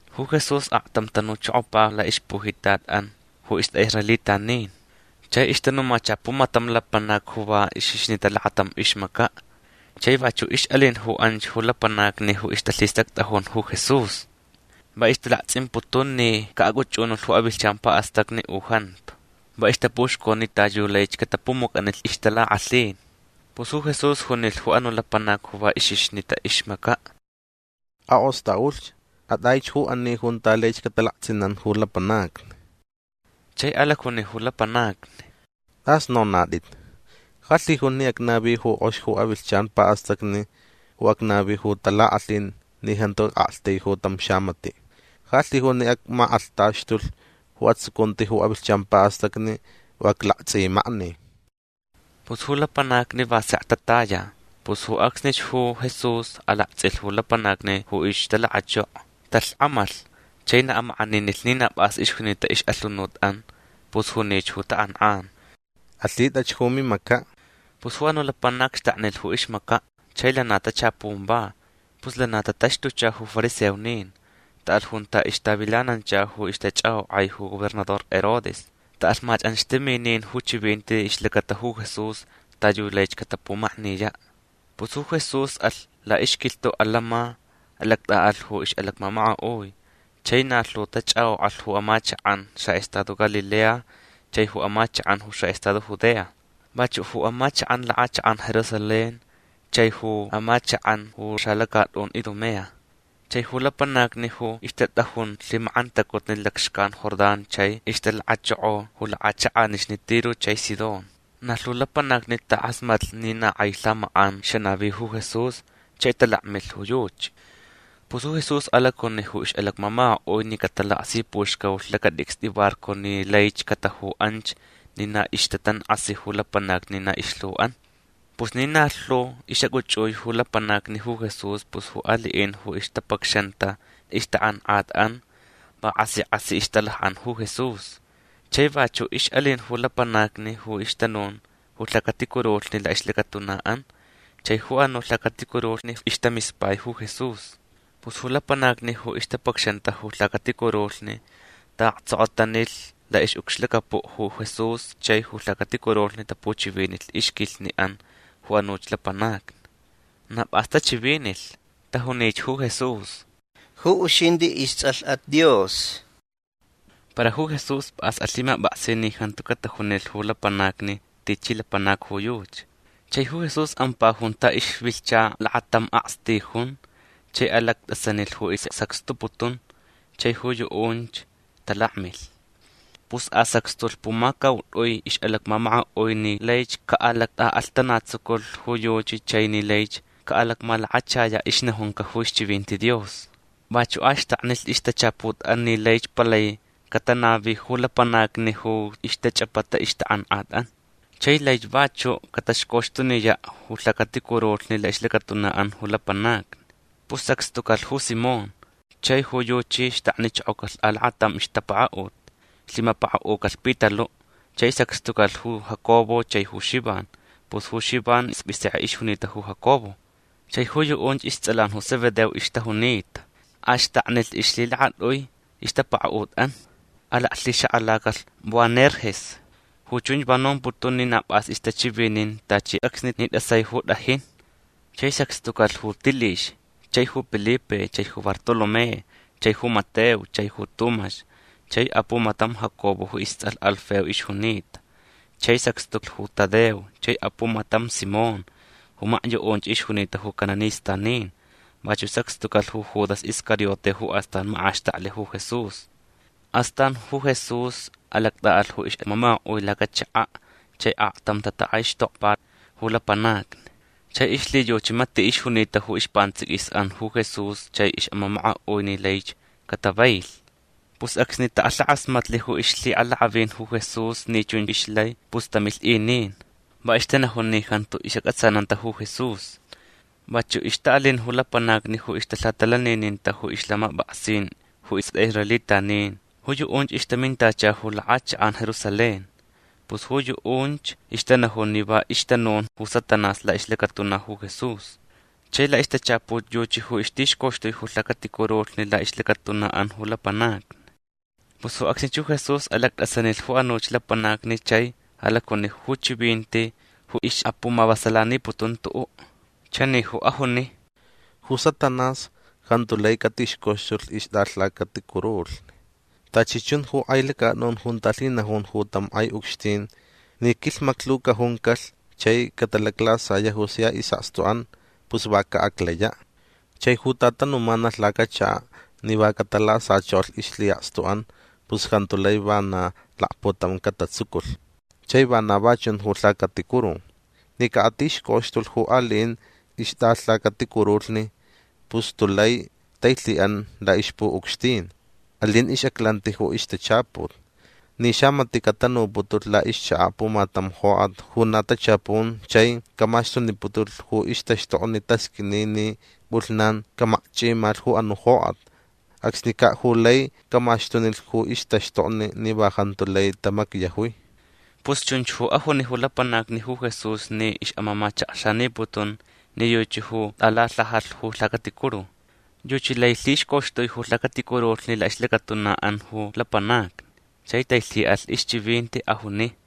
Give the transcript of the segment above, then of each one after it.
Ju Jesús aktam tanuchokopa laʼixpujitatʼan ju istʼaʼisraelitanin. Chai ixtanumacha pumatam lapanac ju va ixixnita lakatam ixmacaʼ. Chai vachuʼ ixʼalin ju anch ju lapanacni ju ixtalhistactʼajun ju Jesús. Va ixtalaktsʼimputun ni caʼacʼuchʼunulh ju avilhchan paʼastacni u jantu. Va ixtapuxconi ta yu laich catapumucʼani ixtalakʼalhin. Pus ju Jesús junilh ju anuʼ lapanac ju va ixixnita ju ixmacaʼ: ―Akʼostʼaʼulh. Atʼaich ju ani junta laich catalaktsʼinan ju lapanacni. Chai alacjunich ju lapanacni: ―Tʼas nonatʼit. Ja lhijun ni acnavi ju kʼox ju avilhchan paʼastacni u acnavi ju talakʼalhin ni jantu acʼaktaiju tam xamatiʼ. Ja lhijun ni acmakʼalhtaxtulh ju atsucunti ju avilhchan paʼastacni u aclaktsʼimakni. Pus ju lapanacni va sekch tataya. Pus ju acsnich ju Jesús alaktsʼilh ju lapanacni ju ixtalakachoko. Talhkʼamalh. Chai na amakʼaninilh ni na pʼas ixjunita ixʼalhunutʼan. Pus junich ju takʼankʼan: ―Alhitʼach ju mimacaʼ. Pus ju anuʼ lapanac xtaknilh ju ixmacaʼ. Chai lana tachapunch va. Pus lana tataxtucha ju fariseonin. Taʼalh junta ixtavilanancha ju ixtachʼakʼokʼai ju gobernador Herodes. Taʼalh machʼanxtaminin ju chivinti ixlacata ju Jesús ta yu laich catapumakniyaʼ. Pus ju Jesús alh laʼixquilhtuʼ atantsʼin. Alactʼaʼalh ju ixʼalacmamakaʼui. Chai na lhu tachʼakʼokʼalh ju amachakʼan xaʼestado Galilea chai ju amachakʼan ju xaʼestado Judea. Vachuʼ ju amachakʼan lakʼachakʼan Jerusalén chai ju amachakʼan ju xalacatʼun Idumea. Chai ju lapanacni ju ixtatʼajun lhimakʼantacutni lacxcan Jordán chai ixtalakachoko ju lakʼachakʼanixni Tiro chai Sidón. Na lhu lapanacni takʼasmatlh ni na kʼai lhamakʼan xanavi ju Jesús chai talakmilh ju yuchi. Pus ju Jesús alacjuni ju ixʼalacmamakaʼui ni catalakasipuxcaulh lacatʼicstʼi barco ni laich cataju anch ni na ixtatankʼasi ju lapanacni ni na ilhuʼan. Pus ni na lhu ixʼacʼuchʼui ju lapanacni ju Jesús pus ju aliʼin ju ixtapacxanta ixtakʼankʼatʼan va kʼasi kʼasi ixtalakʼan ju Jesús. Chai vachuʼ ixʼalin ju lapanacni ju ixtanun ju lhacaticurulhni laʼixlacatunaʼan. Chai ju anuʼ lhacaticurulhni ixtamispai ju Jesús. Pus ju lapanacni ju ixtapacxanta ju lhacaticurulhni taʼaktsokotanilh laʼixʼucxlacapuʼ ju Jesús chai ju lhacaticurulhni tapuchivinilh ixquilhniʼan ju anuch lapanacni. Na pʼas tachivinilh. Tajunich ju Jesús: ―Ju uxintʼi istsʼalhʼat Dios. Para ju Jesús pʼas alhimapʼaksi ni jantu catajunilh ju lapanacni tichi lapanac ju yuchi. Chai ju Jesús ampa junta ixvilhcha lakatam akstijun chai alactʼasanilh ju isʼasacxtuputun. Chai ju yuʼunch talakmilh. Pus asacxtulh pumacautʼui ixʼalacmamakaʼui ni laich caʼalactʼaʼalhtanatsuculh ju yuchi chai ni laich caʼalacmalakachayaʼ ixnajunca ju ixchivinti Dios. Vachuʼ axtaknilh ixtachaputʼan ni laich palai catanavi ju lapanacni ju ixtachʼapata ixtakʼankʼatʼan. Chai laich vachuʼ cataxcoxtuniyaʼ ju lhacaticurulhni laʼixlacatunaʼan ju lapanacni. Pus sacxtucalh ju Simón. Chai ju yuchi xtaknichokocalh alakatam ixtapakaʼut. Lhimapakaʼucalh Pitaluʼ. Chai sacxtucalh ju Jacobo chai ju Xivan. Pus ju Xivan ispʼisekʼe ixjunita ju Jacobo. Chai ju yuʼunch istsʼalan ju Zebedeo ixtajunita. Axtaknilh ixlhilakatʼui ixtapakaʼutʼan. Alaclhixakʼalacalh Boanerges. Ju chunch va nomputun ni na pʼas ixtachivinin tachi acsni tʼasai ju tʼajin. Chai sacxtucalh ju Tilix chai ju Pilipe chai ju Bartolomé chai ju Mateo chai ju Tumax chai apumatam Jacobo ju istsʼalh Alfeo ixjunita. Chai sacxtulh ju Tadeo chai apumatam Simón ju makyuʼunch ixjunita ju cananistanin. Vachuʼ sacxtucalh ju Judas Iscariote ju astan makʼaxtaklh ju Jesús. Astan ju Jesús alactʼaʼalh ju ixʼamamakaʼui lacachakaʼ. Chai aktam tatakʼaixtokpa ju lapanacni. Chai ixlhiyuchi matiʼ ixjunita ju ispantsʼiquisʼan ju Jesús chai ixʼamamakaʼui ni laich catavailh. Pus acsni takʼalhakʼasmatlh ju ixlhiʼalakʼavin ju Jesús ni chunch ixlai pus tamilh inin. Va ixtanajun ni jantu isʼacʼatsananta ju Jesús. Vachuʼ ixtaʼalin ju lapanacni ju ixtalhatalanininta ju ixlhamapʼaksin ju istʼaʼisraelitanin. Ju yuʼunch ixtamintacha ju lakʼachakʼan Jerusalén. Pus ju yuʼunch ixtanajun ni va ixtanun ju Satanás laʼixlacatuna ju Jesús. Chai laʼixtachaput yuchi ju ixtixcoxtui ju lhacaticurulhni laʼixlacatunaʼan ju lapanacni. Pus ju acsnich ju Jesús alactʼasanilh ju anuch lapanacni chai alacjuni ju chivinti ju ixʼapumavasalaniputun tuʼuʼ. Chani ju ajuni: ―Ju Satanás jantu lai catixcoxtulh ixtʼalhacaticurulhni. Tachi chun ju kʼai lacatʼun junta lhinajun ju tam kʼai ucxtin ni quilhmaclhu cajuncalh chai catalaclasayaʼ ju sia isʼakstuʼan pus va caʼaclayaʼ. Chai ju tatanumanalh lacachakaʼ ni va catalasachokolh ixlhiʼakstuʼan pus jantu lai vana lakputam catatsuculh. Chai vana va chun ju lhacaticuru. Ni caʼatixcoxtulh ju aliʼin ixtʼalhacaticurulhni pus tulai tailhiʼan laʼixpuʼucxtin. Alin ixʼaclanti ju ixtachaput. Ni xamatiʼ catanuputulh laʼixchakaʼ pumatam jokʼat ju na tachapun chai camaxtuniputulh ju ixtaxtokni tasqʼuini ni pʼulhnan camakchʼimalh ju anuʼ jokʼat. Acsnicaʼ ju lai camaxtunilh ju ixtaxtokni ni va jantu lai tamacyajui. Pus chunch ju ajuni ju lapanacni ju Jesús ni ixʼamamachakxaniputun ni yuchi ju tʼalalhajalh ju lhacaticuru. Yuchi lai lhixcoxtui ju lhacaticurulhni laʼixlacatunaʼan ju lapanacni. Chai tailhiʼalh ixchivinti. Ajuni: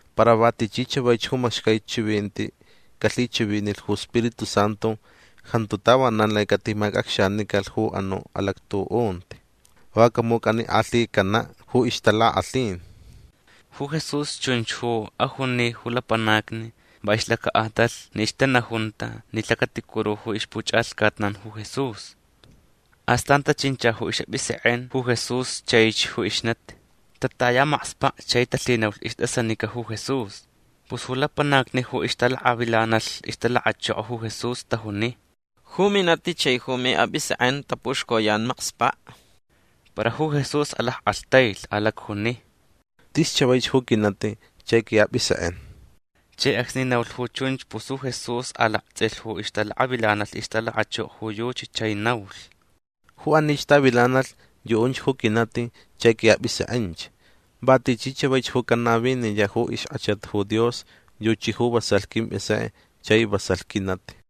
Para va tichi chavaich ju macxcai chivinti calhichivinilh ju Spiritu Santu jantu tavanan lai catimacʼacxanicalh ju anuʼ alactuʼunti. Va camucʼanikʼalhicanaʼ ju ixtalakʼalhin. Ju Jesús chunch ju ajuni ju lapanacni va ixlacaʼatalh ni ixtanajunta ni lhacaticuru ju ixpuchʼalhcatnan ju Jesús. Astan tachincha ju isʼapʼisekʼen ju Jesús chaich ju ixnati. Tataya makspaʼ chai talhinaulh istʼasanica ju Jesús. Pus ju lapanacni ju ixtalakavilanalh ixtalakachokoch ju Jesús tajuni: ―Ju minati chai ju miʼapʼisekʼen tapuxcoyan makspaʼ. Para ju Jesús alackʼalhtailh. Alacjuni: ―Tis chavaich ju quinati chai quiʼapʼisekʼen. Chai acsni naulh ju chunch pus ju Jesús alaktsʼilh ju ixtalakavilanalh ixtalakachoko ju yuchi chai naulh: ―Ju anich tavilanalh yuʼunch ju quinati chai quiʼapʼisekʼench. Va tichi chavaich ju canaviniyaʼ ju ixkʼachat ju Dios yuchi ju vasalh quimpʼisekʼe chai vasalh quinati.